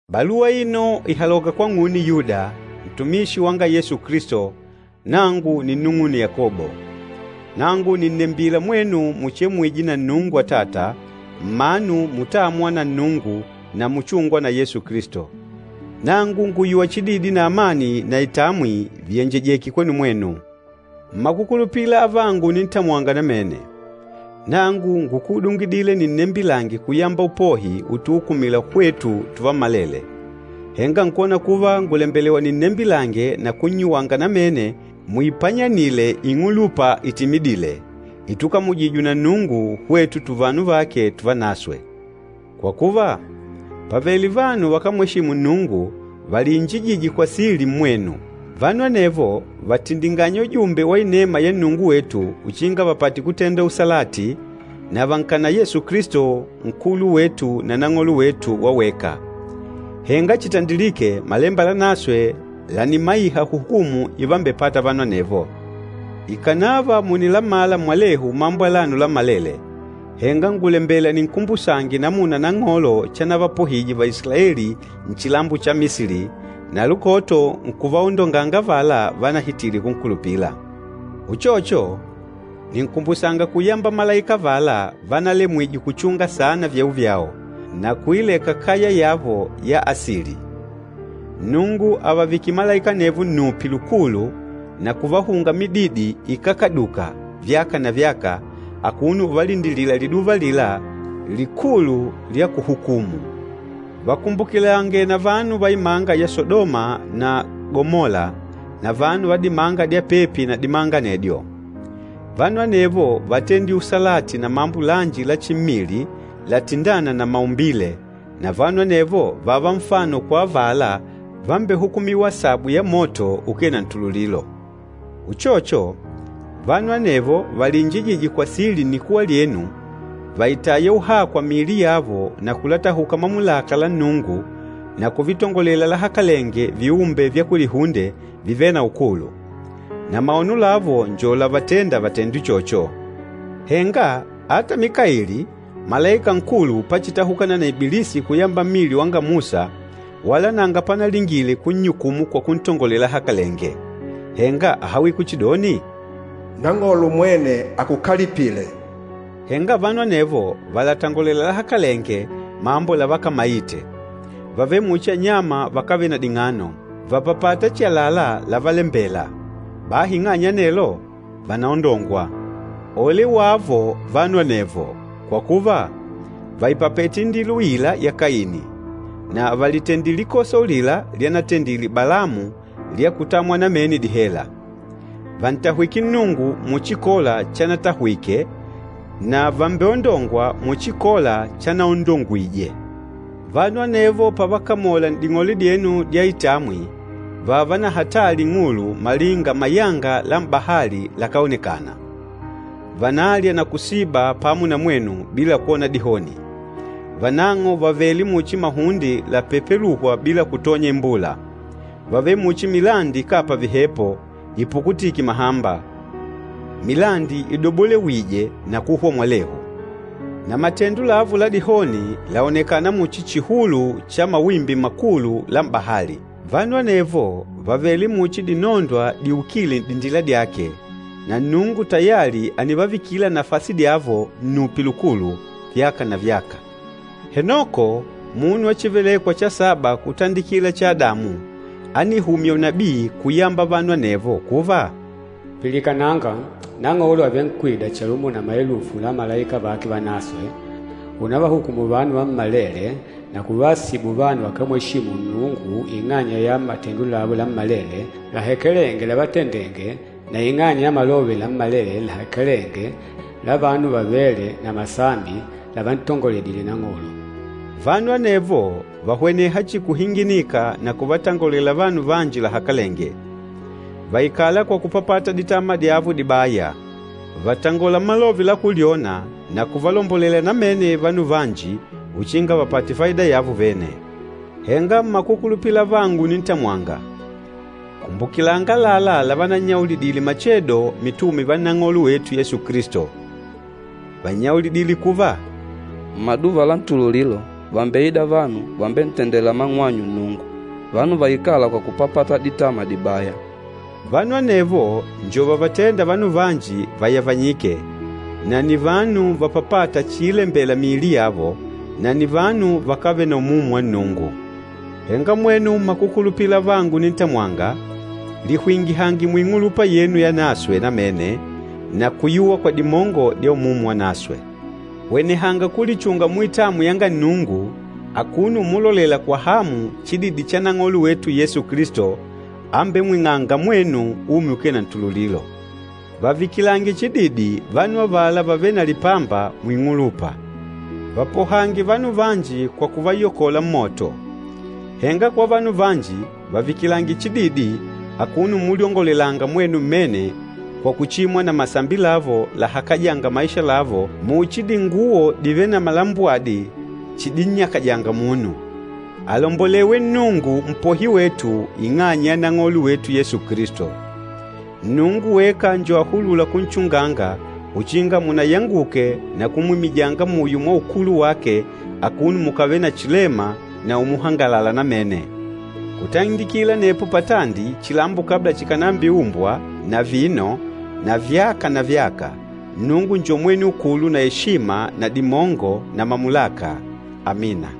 Baluwa aino ìhaloka kwang'une Yuda, ntumishi wanga Yesu Kilisto, nangu ninnung'une Yakobo. Nangu nìnnembila mwenu muchemwîje na Nnungu Atata, mmanu mutâmwa na Nnungu na muchûngwa na Yesu Kilisto. Nangu ngùyuwa chididi na amani na itamwi viyenjejeke kwenu mwenu. Mmakukulupila avangu unintamwanga namene, nangu ngúkudungidile ninnembilange kuyamba upohi utuukumila hwetu tuvammalele, henga nkwona kuva ngùlembelewa ninnembilange na kunnyuwanga namene muipanyanile ing'ulupa itimidîle, itukamujijwe na Nnungu, hwetu tuvanu vake tuvanaswe. Kwa kuva, pàvele vanu vakámweshimu Nnungu valiinjijîje kwa sili mmwenu. Vanu anevo vàtindinganya ujumbe wa inema ya Nnungu wetu uchinga vapate kutenda usalati, na vànkana Yesu Kilisto, Nkulu wetu na Nang'olo wetu wa weka. Henga chitandilìkè, Malemba Lanaswe lànimaiha hukumu imbevapâta vanu anevo. Ikànava mùnilamala mwalehu mambo alano lammalele, henga ngùlembela ninkumbusange namuna Nang'olo chanavapohije Vaisilaeli nchilambo cha Misili, na lukoto nkuvaondonganga avala vanahitile kunkulupila. Uchocho, ninkumbusanga kuyamba malaika avala vanalemwije kuchunga saana vyeo vyao, na kuileka kaya yavo ya asili. Nnungu àvavikile malaika anevo nnupi lukulu na kuvahunga mididi ikákaduka vyaka na vyaka akuno uvalindilila liduva alila likulu lya kuhukumu. Vakumbukilange na vanu va imanga ya Sadoma na Gamola na vanu va dimanga dya pepi na dimanga anedyo. Vanu anevo vátendile usalati na mambo lanji la chimmili latindâna na maumbile, na vanu anevo vààva nfano kwa avala vambehukumîwa asabu ya moto ukee na ntululilo. Uchocho, vanu anevo valiinjijîje kwa sili nnikuwa lyenu vàitaya uhakwa miili yavo na kulatahuka mamulaka la Nnungu na kuvitongolela lahakalenge viumbe vya kulihunde vivêle na ukulu. Na maono lavo njo lávatèndà vatende uchocho. Henga ata Mikaili, malaika nkulu pachitahukana na Ibilisi kuyamba mmili wanga Musa wala nanga panalingile kunnyukumu kwa kuntongolela lahakalenge, henga áhawile kuchidoni, “Nang'olo mwene akukalipile!” Henga vanu anevo vàlatangolela lahakalenge mambo lavakamaite. Vàvele muchi anyama vakávele na ding'ano, vàpapata chihi àlalá lávalembèlà, bahi ing'anya ya anelo, vànaondongwa. Ole wavo vanu anevo! Kwa kuva, vàipapete indila uila ya Kaini, na vàlitendile likosa ulila lyanatendile Balamu lya kutamwa namene dihela. Vàntahwike Nnungu muchi Kola chanatahwike na vàmbeondongwa muchi Kola chanaondongwije. Vanu anevo pavakamola n'ding'ole dyenu dya itamwi vààva na hatali ing'ulu malinga mayanga la m'bahali lakáonekana. Vànalya na kusiba pamo na mwenu bila kwona dihoni. Vanang'o vàvele muchi mahunde lapepelûhwa bila kutonya imbula. Vàvele muchi milandi ikápa vihepo, ipukutîke mahamba, milandi idobolewîje na kuhwa mwalehu. Na matendo lavo la dihoni làonekana muchi chihulu cha mawimbi makulu la m'bahali. Vanu anevo vàvele muchi dinondwa diukîle n'dindila dyake, na Nnungu tayali ànivavikila nafasi dyavo nnupi lukulu, vyaka na vyaka. Henoko, munu wa chívelèkwà cha saba kutandikila cha Adamu, ánihumya unabii kuvayamba vanu anevo kuva, “Pilikananga, Nang'olo àvenkwida chalumo na maelufu la malaika vake vanaswe, únavahukùmù vanu vammalele na kuvaasibu vanu vakámweshimu Nnungu ing'anya ya matendo lavo lammalele lahakalenge lávatendèngè na ing'anya ya malove lammalele lahakalenge la vanu vavêle na masambi lavantongoledile Nang'olo.” Vanu anevo vàhweneha chihi kuhinginika na kuvatangolela vanu vanji lahakalenge. Vàikala kwa kupapata ditama dyavo dibaya. Vàtangola malove la kulyona na kuvalombolela namene vanu vanji uchinga vapate faida yavo vene. Henga mmakukulupila avangu unintamwanga, kumbukilanga àlalá lavanannyaulidile machedo mitume va Nang'olo wetu Yesu Kilisto. Vánnyaulidile kuva, “Mmaduva la ntululilo vàmbeida vanu vambentendêla mang'wanyu Nnungu, vanu vaikâla kwa kupapata ditama dibaya.” Vanu anevo njo vavatênda vanu vanji vayavanyike, na nni vanu vapapâta chiilembela miili yavo, na nni vanu vakávele na Umumu wa Nnungu. Henga mwenu mmakukulupila avangu unintamwanga, lihwingihange muing'ulupa yenu yanaswe namene na kuyuwa kwa dimongo dya Umumu Wanaswe. Hwenehanga kulichunga muitamwi yanga Nnungu akuno umulolela kwa hamu chididi cha Nang'olo wetu Yesu Kilisto, ambemwing'ânga mwenu umi ukee na ntululilo. Vavikilange chididi vanu avala vavêle na lipamba muing'ulupa. Vapohange vanu vanji kwa kuvayokola mmoto. Henga kwa vanu vanji, vavikilange chididi akuno umulyongolelanga mwenu mmene kwa kuchimwa na masambi lavo lahakajânga maisha lavo muchi dinguwo divêle na malambwadi chidinnyakajanga munu. Alombolewe Nnungu Mpohi wetu ing'anya ya Nang'olo wetu Yesu Kilisto! Nnungu weka njo ahulûla kunchunganga uchinga munayanguke na kumwimijanga muyo mwa ukulu wake akuno mukávele na chilema na umuhangalala namene. Kutandikila anepo patandi chilambo kabla chikànambiumbwa na vino na vyaka na vyaka, Nnungu njo mwene ukulu na eshima na dimongo na mamulaka! Amina.